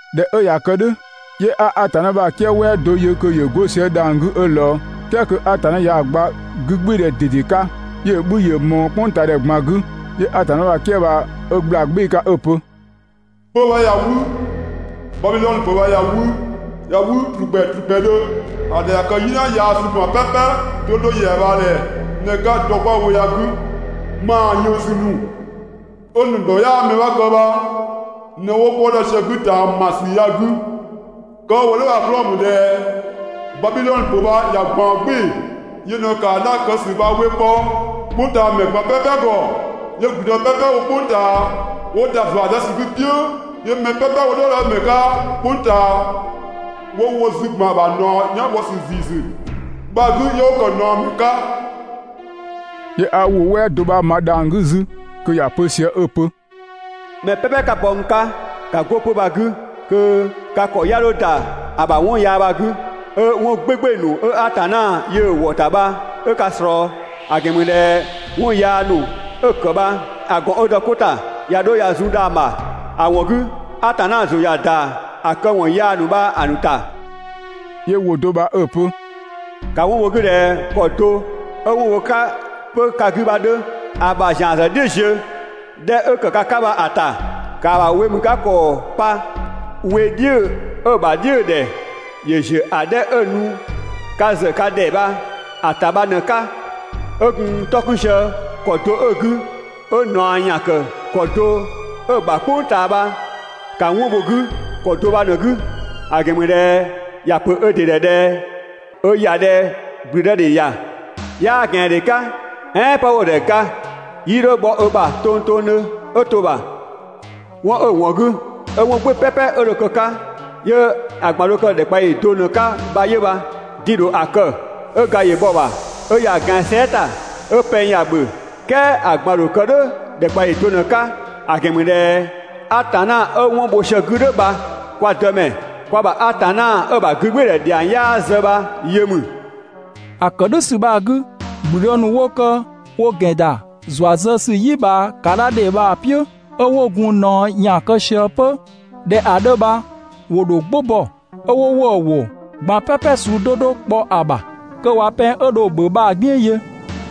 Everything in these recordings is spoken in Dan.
꞊Dhɛ 'ö ꞊ya kë "dhʋ̈, 'yö 'a Atanna ‑bha "kië "wɛɛ do yö kö ‑yö 'go sië dhang‑ 'gü 'ö ꞊lɔɔ, "kɛɛ kö Atanna ꞊yaa‑ gba 'gügbɩɩdhɛ ꞊dede 'ka, 'yö‑ 'bhü ‑yö ꞊mɔɔ "kpʋngtaadhɛ ꞊gban 'gü. 'Yö Atanna ‑bha "kië bha 'ö ‑gbla "gbɩɩ‑ 'ka 'ö‑ pö: «'Pö‑ bha ꞊ya 'wü, Babidhɔnö ‑pö bha ꞊ya 'wü, ꞊ya 'wü ‑trukpɛ ‑trukpɛdhö. ‑A ‑dhɛ ꞊ya kë "yina yaa suu ꞊gban "pɛpɛ 'do 'do ‑yɛa ꞊bhaa ‑dhɛ ꞊në‑ 'ka dɔ 'kwa‑ wo ya‑ 'gü. ‑Maa ‑yënngsü ‑nu 'ö‑ ‑nu ‑dhɔ 'yaa mɛ 'bha kë bha ꞊në 'wo 'kɔ dɔ sië‑ 'gü ꞊taamasü ya‑ 'gü. Kë 'ö‑ wo "dhʋ̈ bha‑ 'klɔɔ‑ ‑mü ꞊dhɛ Babidhɔnö ‑pö bha ꞊ya ꞊gbaɔn "gbɩɩ‑. Yö ꞊në ‑kaa dha kë ‑sü bha‑ we kpɔ "kpʋngtaamɛ ꞊gban "pɛpɛ ‑gɔ, 'yö ‑gblüdë "pɛpɛ 'wo "kpʋng ꞊taa 'wo ‑da ‑zua zë ‑sü 'gü‑ "piʋ̈, 'yö mɛ "pɛpɛ 'wo "dhɔɔdɔmɛ ‑nu 'ka "kpʋng ꞊taa 'wo wo zü ‑gban ‑a ‑bha ꞊naɔ "yan bhɔ ‑sü ‑ziisü bha‑ 'gü 'yö 'wo ‑kë ꞊naɔmɛ 'ka.» 'Yö 'a ‑wʋ "wɛɛ do 'bha ma dhang‑ 'gü 'zü kö ‑ya pö sië 'ö‑ pö: «Mɛ "pɛpɛ 'ka bɔ n 'ka ‑ka 'go 'pö‑ bha‑ 'gü, kö ka ‑kɔ 'ya 'dho ‑da ‑a ‑bha 'wɔn yaa bha‑ 'gü, 'ö 'wɔn "gbɩɩgbɩɩ‑ ‑nu 'ö Atanna yöö‑ wɔ‑ ‑ta bha 'ö ka ꞊slɔɔ. ‑A ‑gɛn ‑mü ꞊dhɛ 'wɔn yaa ‑nu 'ö‑ ‑kë bha‑ ‑gɔn 'ö dɔ 'ko ‑ta ꞊ya 'dho ꞊ya zun dhang‑ ‑bha, ‑a ‑wɔn 'gü, Atanna ‑zʋ ꞊ya ‑da ‑a këwɔn yaa ‑nu bha‑ ‑nu ‑ta. 'Yö ‑wʋ do bha 'ö‑ pö: «‑Ka 'wɔn bho‑ 'gü ꞊dhɛ ‑kɔ do 'ö 'wɔn bho‑ 'ka 'pö ka 'gü bha‑ 'dhö. ‑A ‑bha ‑zian ‑zë "dhiʋ̈‑ ziö‑ 'dhɛ 'ö‑ ‑kë ka 'ka bha‑ ‑ta. ‑Kaa ‑bha wemükakɔɔ pa we "dhiʋ̈‑ 'ö‑ ‑bha "dhiʋ̈dhɛ ‑yö ‑ziö ‑a 'dhɛ 'ö‑ nu ka ‑zë ka ‑dhɛ bha‑ ‑ta bha ꞊në‑ 'ka. 'Ö gun 'tɔ 'kun sië ‑kɔ do 'ö‑ 'gü, 'ö ꞊naɔ ‑yan ‑kë ‑kɔ do 'ö‑ ‑bha "kpʋng ꞊taa bha ‑ka 'wɔn bho‑ 'gü ‑kɔ do bha ꞊në‑ 'gü. ‑A ‑gɛn ‑mü ꞊dhɛ ‑ya ‑pö ö ‑dɩ ‑dhɛ ꞊dhɛ ö ‑ya ꞊dhɛ ‑gblüdëdhe ‑ya, 'yaa ꞊gɛandhe 'ka, "ɛɛn 'pë 'wo‑ ‑dhɛ ga, 'yii 'dho bhɔ ö ‑bha tongtongdhö 'ö to‑ ‑bha. 'Wɔn 'ö‑ ‑wɔn 'gü 'yö 'wɔn "gbɩɩ‑ "pɛpɛ 'ö dho kë‑ 'ka 'yö‑ ꞊gban dho kë ‑dhɛkpaɔyi do ꞊në‑ 'ka bha 'yö bha. Din‑ ‑dho ‑a kë, 'ö ga ‑yö bhɔ‑ ‑bha, 'ö ‑ya ꞊gɛan sɛɛ" ‑ta, 'ö pɛng ‑ya ‑bhö, "kɛɛ ‑a ꞊gban‑ ‑dho kë "dhʋ̈ ‑dhɛkpaɔyi do ꞊në‑ 'ka, ‑a ‑gɛn ‑mü ꞊dhɛ Atanna 'ö 'wɔn bho sië‑ 'gü "dhʋ̈ bha kwa Dëmɛ, kwa ‑bha Atanna 'ö‑ ‑bha 'gügbɩɩdhɛ ‑dhiang 'yaa zë bha‑ yö ‑mü.» ‑A ‑kë "dhʋ̈ ‑sü bha‑ 'gü, ‑gblüdë ‑nu 'wo kë wo ‑gɛn ‑da ‑zua zë ‑sü "yi ꞊bhaa ‑kaadhadhe bha‑ "piʋ̈, 'ö 'wo gun ꞊naɔ ‑yan kë sië 'pö ꞊dhɛ‑ 'dhö bha ‑wo ‑dho "gbʋ bɔ, 'ö 'wo ‑wëë ‑wʋ ꞊gban "pɛpɛ suu 'do 'do kpɔ‑ ‑bha, kö ꞊wa pɛng 'ö dho‑ ‑bhö bha‑ "gbiën yö.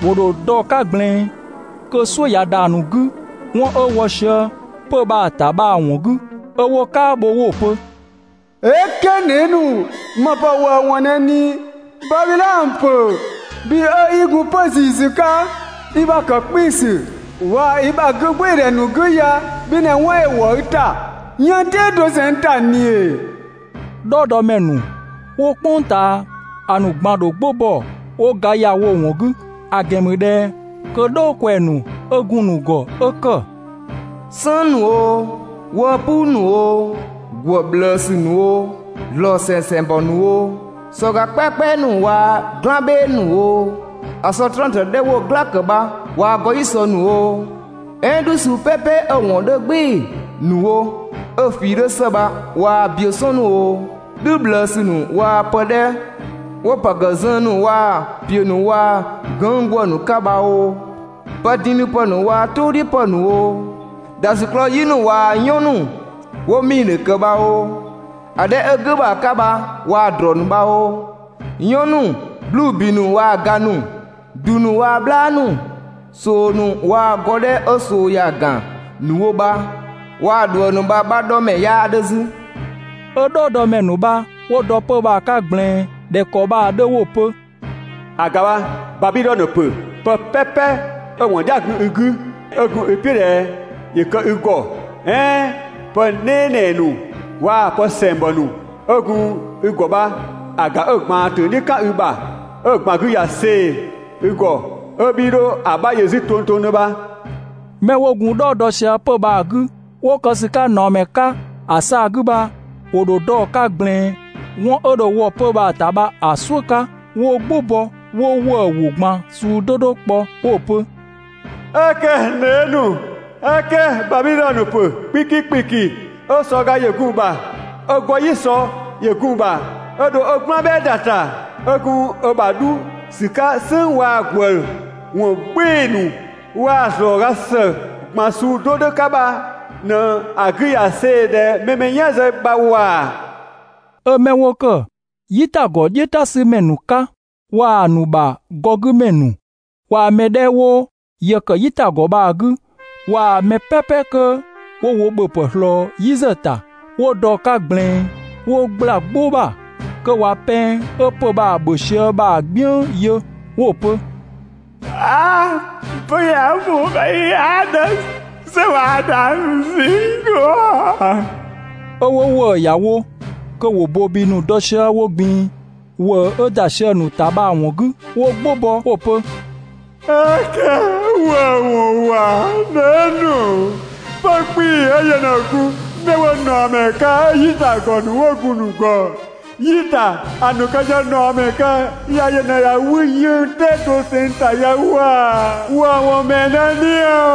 ‑Wo ‑dho dɔ‑ 'ka ꞊gblɛɛn, kö "suʋ̈ ꞊ya ‑da ‑nu 'gü 'wɔn 'ö wɔ sië 'pö‑ bha‑ ‑ta bha‑ ‑wɔn 'gü 'ö 'wo "kaabho 'wo‑ pö: «"Eke, n dhee" ‑nu, ‑më ‑pë ‑wëëwɔn ꞊në ꞊ni? Babidhɔnö ‑pö, bhi 'ö 'i gun 'pö‑ ‑ziisü 'ka i ‑bha ‑kë 'kpiisü waa‑ i ‑bha 'gügbɩɩdhɛ ‑nu 'gü ya bhi ꞊në 'wɔn ‑yö ‑wɔ i ‑ta 'yënng‑ "tɛɛ doseng ‑ta ꞊ni ‑ee?» "Dhɔɔdɔmɛ ‑nu 'wo "kpʋng ꞊taa‑ ꞊gban‑ ‑dho "gbʋ bɔ 'wo ga ‑ya wo‑ ‑wɔn 'gü, ‑a ‑gɛn ‑mü ꞊dhɛ 'kö "dhɔɔ ꞊kwɛɛ‑ ‑nu 'ö gun‑ ‑nu ‑gɔ 'ö ‑kë "sënng ‑nu oo, 'wëë‑ "puu ‑nu oo, ‑gwë ꞊bhlëësü ‑nu oo, ‑zlɔɔ ‑sɛsɛngbɔ ‑nu oo, sɔga "kpɛakpɛa ‑nu waa‑ "gblan "bhɛɛ ‑nu oo, ‑a sɔ 'trëngtrëng 'dhɛ 'wo‑ "gla ‑kë bha waa‑ 'gɔ‑ "yi sɔ ‑nu oo, "ɛɛn "dhü suu "pɛpɛ 'ö‑ ‑wɔn 'dhö "gbɩɩ‑ ‑nu wo 'ö‑ ꞊fii 'dhö ‑së bha waa‑ biö "sɔn ‑nu oo, "dhü ꞊bhlëësü ‑nu waa‑ pë 'dhɛ 'wo‑ ‑pë ‑kë zën ‑nu waa‑ ‑piö ‑nu waa‑ gënng' ‑gwë ‑nu 'ka bha oo, pëdindhipë ‑nu waa‑ "tʋʋ "dhiʋ̈ ‑pë ‑nu oo, ‑dhasiklɔɔ yi ‑nu waa‑ "yɔn ‑nu 'wo‑ 'miidhö ‑kë bha oo, ‑a 'dhɛ 'ö "gʋ̈ ‑bha 'ka bha waa‑ ‑drɔɔ ‑nu bha oo, "yɔn ‑nu, 'bluu‑ ‑bi ‑nu waa‑ ga ‑nu, ‑du ‑nu waa‑ "bhlaa ‑nu, ꞊soo ‑nu waa‑ gɔ 'dhɛ 'ö ꞊soo ‑ya ‑gan ‑nu wo bha waa‑ ꞊dhuëng ‑nu bha‑ 'bha 'dhɔ mɛ 'yaa 'dhö 'zü. 'Ö "dhɔɔdɔmɛ ‑nu bha 'wo dɔ 'pö‑ bha‑ 'ka ꞊gblɛɛn ꞊dhɛ ‑kɔ bha‑ 'dhö 'wo‑ pö: «‑A ‑ga bha, Babidhɔnö ‑pö, pë "pɛpɛ 'ö‑ ‑wɔn "dhia‑ gun i 'gü, 'ö gun i "piʋ̈ ꞊dhɛ ‑yö kë i ‑gɔ, "ɛɛn pë "nɛɛnɛɛ ‑nu waa‑ pë ‑sɛngbɔ ‑nu 'ö gun i ‑gɔ bha‑ ‑ga 'ö‑ ꞊gbaan ‑töng "dhiʋ̈ "kan i ‑bha, 'ö‑ ꞊gban 'gü ꞊ya see‑ i ‑gɔ 'ö 'bhii 'dho‑ 'bha yö 'zü tongtongdhö bha.» 'Mɛ 'wo gun "dhɔɔ dɔ sië 'pö‑ bha‑ 'gü 'wo kë ‑sü 'ka ꞊naɔmɛ 'ka ‑a 'saa‑ 'gü bha, ‑wo dho dɔ‑ 'ka ꞊gblɛɛn 'wɔn 'ö dho wɔ 'pö‑ bha‑ ‑ta bha‑ "suʋ̈ 'ka 'wo "gbʋ bɔ 'wo ‑wëë ‑wʋ ꞊gban suu 'do 'do kpɔ 'wo‑ pö: «"Eke, n dhee" ‑nu! "Eke! Babidhɔnö ‑pö 'kpiki ‑kpiki 'ö sɔ ga ‑yö gun‑ ‑bha, 'ö 'gɔ‑ "yi sɔ ‑yö gun‑ ‑bha, 'ö dho ö "gblan "bhɛɛ ‑da ‑ta, 'ö gun ö ‑bha 'dhu ‑sü 'ka "sënng waa‑ ‑gwë ‑wɔn "gbɩɩ‑ ‑nu waa‑ ‑zlɔɔga ‑së ꞊gban suu 'do 'do 'ka bha ꞊në‑ 'gü ꞊ya see‑ ꞊dhɛ mɛ‑ mɛ "yan zë bha ‑wa! 'Ö 'mɛ 'wo ‑kë "yitagɔ "dhiʋ̈ "ta ‑sü ‑mɛ ‑nu 'ka waa‑ ‑nu ‑bha gɔ 'gü ‑mɛ ‑nu waa‑ mɛ 'dhɛ 'wo yë ‑kë "yitagɔ bha‑ 'gü, waa‑ mɛ "pɛpɛ 'kö 'wo wo ‑bhöpë ꞊slɔɔ "yi ‑zë ‑ta, 'wo dɔ‑ 'ka ꞊gblɛɛn 'wo ꞊gbla "gbʋ ‑bha kö ꞊wa pɛng 'ö 'pö‑ bha ‑bhö sië bha‑ "gbiën yö 'wo‑ pö: «'A! 'pö‑ ya‑ ‑mɔɔ 'ka 'yaa 'dhö "sɛ waa‑ dhang‑ ‑nu ꞊zinng 'gü!» 'Ö 'wo ‑wëë ‑ya wo, kö ‑wo ‑bobi ‑nu dɔ sië wo ꞊gbin‑ ‑wëë 'ö ‑da sië‑ ‑nu ‑ta bha‑ ‑wɔn 'gü, 'wo "gbʋ bɔ 'wo‑ pö: «"Eke! ‑Wëëwɔn ‑wa! N dhee" ‑nu! 'Pö‑ 'kpii‑ 'ö yö ꞊në gun 'mɛ 'wo ꞊naɔmɛ 'ka 'ö "yitagɔ ‑nu 'wo‑ ‑nu ‑gɔ "yi ‑ta ‑a ‑nu kë sië ꞊naɔmɛ 'ka ya ꞊në ꞊ya 'wü 'yënng‑ "tɛɛ doseng ‑ta ya ‑wa! ‑Wëëwɔn ‑mɛɛ ꞊në ya?»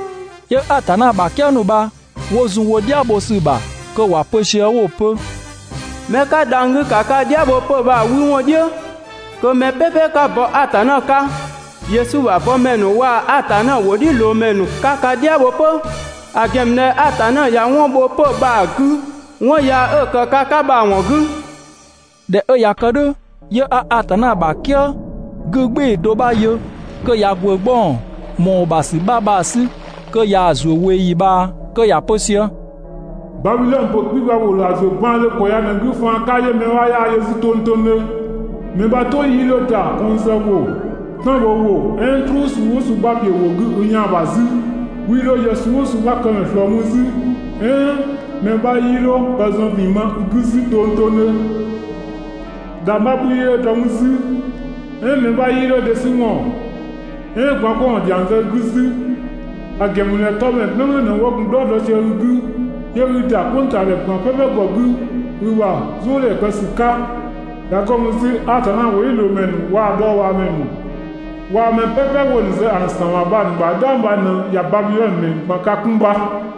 'Yö Atanna ‑bha "kië ‑nu bha 'wo zun wo "dhia bho ‑sü ‑bha kö ‑wa pö sië 'wo‑ pö: «'Mɛ 'ka dhang‑ 'gü ‑ka ka "dhia bho 'pö‑ bha‑ 'wü ‑wɔn "dhiʋ̈, kö mɛ "pɛpɛ 'ka bɔ Atanna 'ka, Yesu ‑bha bɔmɛ ‑nu waa‑ Atanna ‑wʋdhiʋ̈loomɛ ‑nu 'ka ka "dhia bho 'pö. ‑A ‑gɛn ‑mü ꞊dhɛ Atanna ꞊ya 'wɔn bho 'pö‑ bha‑ 'gü 'wɔn yaa 'ö‑ ‑kë ka 'ka bha‑ ‑wɔn 'gü. ꞊Dhɛ 'ö ꞊ya kë "dhʋ̈, 'yö 'a Atanna ‑bha "kië 'gügbɩɩ do 'bha yö kö ꞊ya ‑gwë 'gbɔng ‑mɔɔ ‑bha ‑sü 'bha bha‑ 'sü kö ꞊yaa‑ ‑zuö ꞊weeyi ꞊bhaa kö ‑ya pö sië: «Babidhɔnö ‑pö 'kpii‑ bha ‑wo ‑dho ‑a ‑zuö baandhö ‑kɔ ya ꞊në‑ 'gü faan 'ka 'yö mɛ 'bha 'yaa‑ yö 'zü tongtongdhö. Mɛ 'bha "tʋ 'yii 'dho ‑da kɔnng zë ‑wʋ, "tan bho ‑wʋ "ɛɛn "truu suu "ʋʋ suu 'bha ‑piö ‑wʋ 'gü i yaan‑ ‑bha 'zü, 'wii 'dho yë suu "ʋʋ suu 'bha këmɛ ꞊slɔɔ mü 'zü, "ɛɛn mɛ 'bha 'yii 'dho pë zɔn ‑vin ma i 'gü 'zü tongtongdhö. ‑Dhangbha 'bhü 'yii 'dho dɔ mü 'zü, "ɛɛn mɛ 'bha 'yii 'dho dhe 'sü ‑wɔn, "ɛɛn gwaan‑ 'kpɔ ‑wɔn ‑dhiang ‑zian zë i 'gü 'zü. ‑A ‑gɛn ‑mü ꞊dhɛ 'tɔmɛ "gblʋ̈gblʋ̈ ꞊në 'wo gun "dhɔɔ dɔ sië i 'gü, 'yö 'i ‑da "kpʋngtaamɛ ꞊gban "pɛpɛ ‑gɔ 'gü i ‑bha "zʋʋdhɛ kë ‑sü 'ka.» ꞊Ya 'go mü 'zü Atanna ‑wʋdhiʋ̈loomɛ ‑nu waa‑ dhɔɔbhaamɛ ‑nu waa‑ mɛ "pɛpɛ 'wo‑ ‑nu zë ‑a ‑nu ‑san ‑bha bha‑ ‑nu ‑bha "dhang bha ꞊në ꞊ya Babidhɔnö ‑mɛ ‑nu ꞊gban ka 'kun bha.»